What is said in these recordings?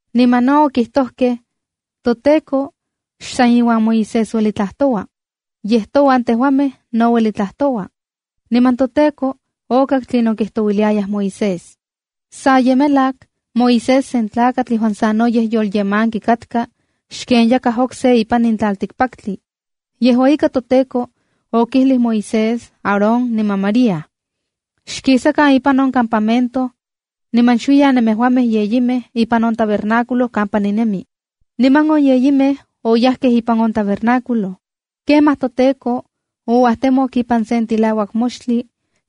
Niman no okijtojkej: “ToTEKO xsan iuan Moisés ueli tlajtoua. Yej touan tejuamej no ueli tlajtoua.” Niman toTEKO okak tlinon kijtouiliayaj Moisés. (Sa ye melak Moisés sen tlakatl yejuan sanoyej yolyemanki katka xken yakaj okse ipan in tlaltikpaktli.) Yejua ika, toTEKO okijlij Moisés, Aarón niman María: “Xkisakan ipan on campamento niman xuiyan nemejuamej yeyimej ipan on tabernáculo kampa ninemi.” Niman on yeyimej oyajkej ipan on tabernáculo. Kemaj toTEKO ouajtemok ipan sen tilauak moxtli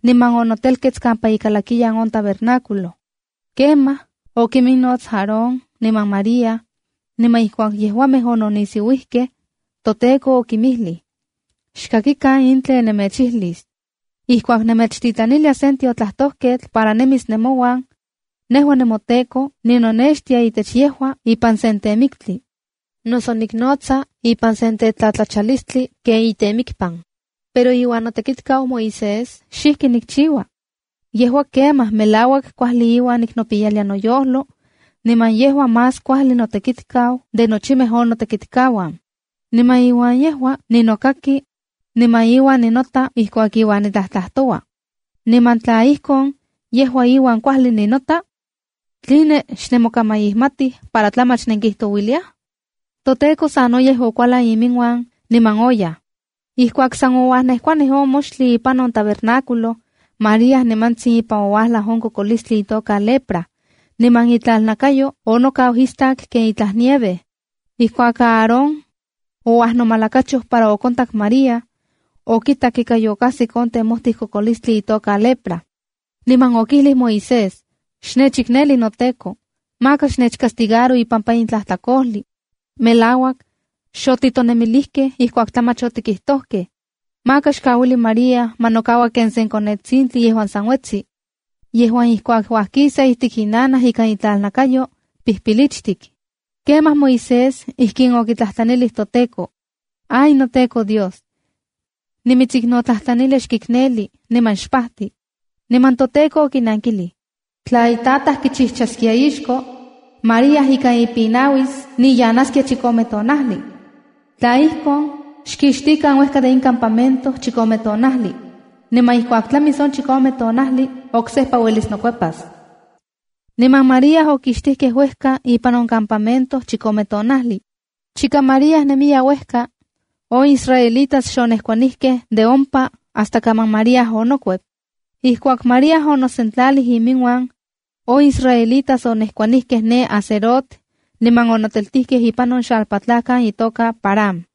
niman onotelkets kampa ikalakiyan on tabernáculo. Kemaj okominnots Aarón niman María, niman ijkuak yejuamej ononisiuijkej, toTEKO okinmijlij: “Xkakikan in tlen nemechijlis: Ijkuak nemechtitlanilia sen tiotlajtojketl para nemis nemouan, nejua nemoTEKO, ninonextia itech yejua ipan sen temiktli, noso niknotsa ipan sen tetlatlachalistli ken itemikpan. Pero iuan notekitkau Moisés xijki nikchiua. Yejua kemaj melauak kuajli iuan niknopiyalia noyojlo, niman yejua más kuajli notekitkau de nochimej on notekitkauan. Niman iuan yejua ninokaki niman iuan ninota ijkuak iuan nitlajtlajtoua. Niman tla ijkon, yejua iuan kuajli ninota, ¿tline xnemokamaijmatij para tlamach nenkijtouilia?” ToTEKO sanoyej okualan iminuan niman oyaj. Ijkuak san ouajnejkuanij on moxtli ipan on tabernáculo, María nimantsin ipan ouajlaj on kokolistli itoka lepra, niman itlalnakayo onokau istak ken itlaj nieve. Ijkuak Aarón ouajnomalakachoj para okontak María, okitak ika yokajsik on temojtij kokolistli itoka lepra. Niman okijlij Moisés: “Xtechikneli noteko. Maka xtechcastigaro ipampa in totlajtlakol. Melauak xotitonemilijkej, ijkuak tlamach otikijtojkej. Maka xkauili María ma nokaua ken se konetsintli yejuan san uetsi, yejuan ijkuak uajkisa ijtik inanaj ikan itlalnakayo, pijpilichtik.” Kemaj Moisés ijkin okitlajtlanilij toTEKO: “¡Ay noTEKO Dios, nimitsiknotlajtlanilia xkikneli, niman xpajti!” Niman toTEKO okinankilij: “Tla itataj kichijchaskia ixko, María ikan ipinauis niyanaskia chikome tonajli. Tla ijkon, xkixtikan uejka de in campamento chikome tonajli. Niman ijkuak tlamis on chikome tonajli, oksejpa uelis nokuepas.” Niman María okixtijkej uejka ipan on campamento chikome tonajli. Chika María nemiya uejka, on israelitas xonejkuanijkej de ompa hasta kaman María onokuep. Ijkuak María onosentlalij iminuan, on israelitas onejkuanijkej ne Hazerot niman onoteltijkej ipan on xalpatlajkan itoka Parán.